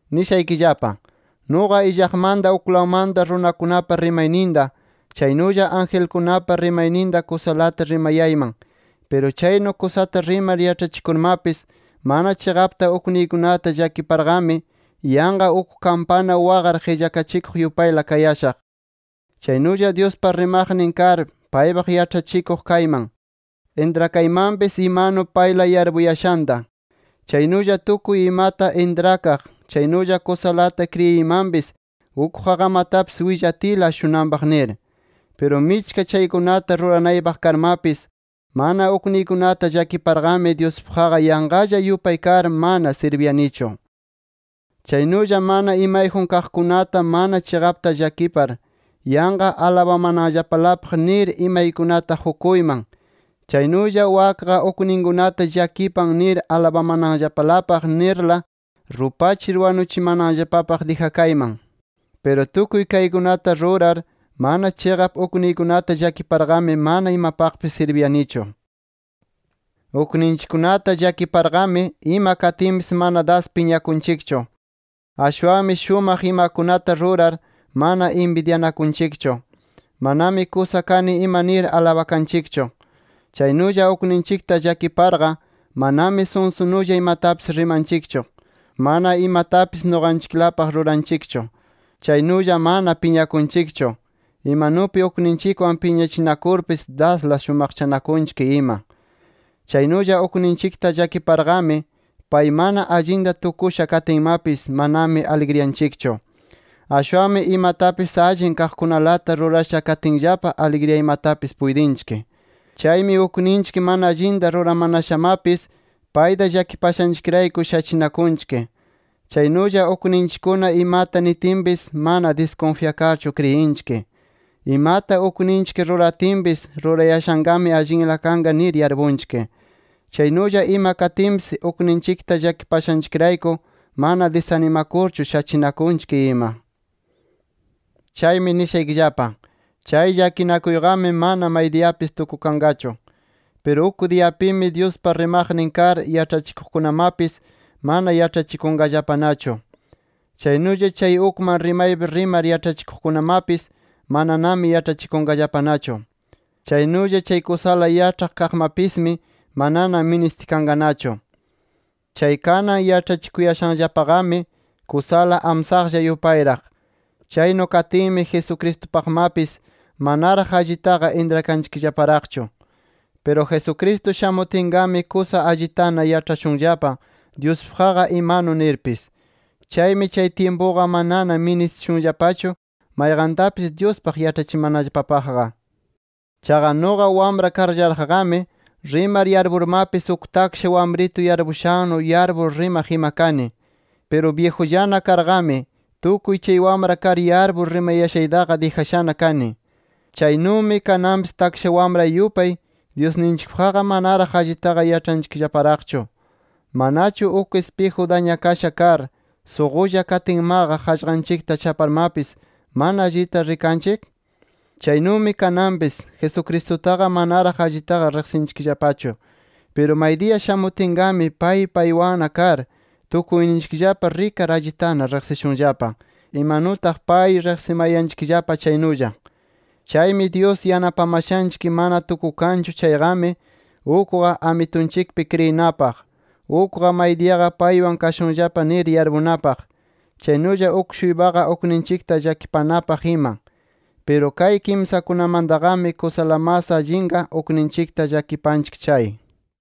Nishaykillapa: Nuqa illaqmanta uklawmanta runakunapa rimayninta, chaynulla angelkunapa rimayninta kusalata rimayayman. Piru chaynu kusata rimar yaĉhachikurmapis, mana chiqapta ukniykunata llakiparqami, yanqa uk kampana waqar qillakachikuq yupayla kayashaq. Chaynulla Dyuspa rimaqnin kar paypaq yaĉhachikuq kayman, intrakaymanpis imanu payla yarpuyashanta. Chaynulla tukuy imata intrakaq, chaynulla kusalata kriyiymanpis uk qaqamatapis willatiyla ashunanpaq nir. Piru michka chaykunata ruranaypaq karmapis, mana ukniykunata llakiparqami, Dyuspaqqa yanqalla yupay kar mana sirbiyanichu. Chaynulla mana imayjun kaqkunata mana chiqapta llakipar, yanqa alabamananllapalapaq nir imaykunata qukuyman, chaynulla wakqa ukninkunata llakipan nir alabamananllapalapaq nirla rupachir wanuchimananllapapaq dijakayman. Piru tukuy kaykunata rurar mana chiqap ukniykunata llakiparqami, mana imapaqpis sirbiyanichu. Ukninchikkunata llakiparqami, ima katinpis mana das piñakunchikchu. Ashwanmi shumaq imakunata rurar, mana inbidyanakunchikchu. Manami kusa kani ima nir alabakanchikchu. Chaynulla ukninchikta llakiparqa, manami sunsunulla imatapis rimanchikchu, mana imatapis nuqanchiklapaq ruranchikchu, chaynulla mana piñakunchikchu, imanupi ukninchikwan piñachinakurpis dasla shumaqchanakunchik ima. Chaynulla ukninchikta llakiparqami, pay mana allinta tukusha katinmapis, manami aligriyanchikchu. Ashwanmi imatapis allin kaqkunalata rurasha katinllapa aligriyaymatapis puytinchik. Chaymi ukninchik mana allinta ruramanashamapis, payta llakipashanchikrayku shachinakunchik. Chaynulla ukninchikkuna imata nitinpis mana diskunfyakarchu kriyinchik. Imata ukninchik ruratinpis, rurayashanqami allinla kanqa nir yarpunchik. Chaynulla ima katinpis, ukninchikta llakipashanchikrayku mana disanimakurchu shachinakunchik ima. Chaymi nishaykillapa: Chay llakinakuyqami, mana maydiyapis tukukanqachu. Piru uk diyapimi Dyuspa rimaqnin kar yaĉhachikuqkunamapis, mana yaĉhachikunqallapanachu. Chaynulla chay ukman rimaypi rimar yaĉhachikuqkunamapis mananami yaĉhachikunqallapanachu. Chaynulla chay kusala yaĉhaq kaqmapismi manana ministikanqanachu. Chay kanan yaĉhachikuyashanllapaqami, kusala amsaqlla yupayraq. Chaynu katinmi, Jesucristupaqmapis, manaraq allitaqa intrakanchikllaparaqchu. Piru Jesucristo shamutinqami, kusa allitana yaĉhashunllapa Dyuspaqqa imanu nirpis. Chaymi chay tyimpuqa manana ministishunllapachu mayqantapis Dyuspaq yaĉhachimanallapapaqqa. Chaqa nuqa wamra karllaraqqami, rimar yarpurmapis, uk taksha wamritu yarpushannu yarpur rimaq ima kani. Piru byijullana karqami, tukuy chay wamra kar yarpur rimayashaytaqa, dijashana kani. Chaynumi, kananpis taksha wamra yupay, Dyusninchikpaqqa manaraq allitaqa yaĉhanchikllaparaqchu. ¿Manachu uk ispiju dañakasha kar suqulla katinmaqa, qaqllanchikta chaparmapis mana allita rikanchik? Chaynumi kananpis, Jesucristutaqa manaraq allitaqa riqsinchikllapachu. Piru maydiya shamutinqami, pay paywanna kar, tukuyninchikllapa rikar allitana riqsishunllapa, imanutaq pay riqsimayanchikllapa chaynulla. Chaymi Dyus yanapamashanchik mana tukukanchu chayqami, ukqa Amitunchikpi kriyinapaq, ukqa maydiyaqa paywan kashunllapa nir yarpunapaq, chaynulla uk-shuypaqa ukninchikta llakipanapaq ima. Piru kay kimsakunamantaqami, kusala mas allinqa ukninchikta llakipanchik chay.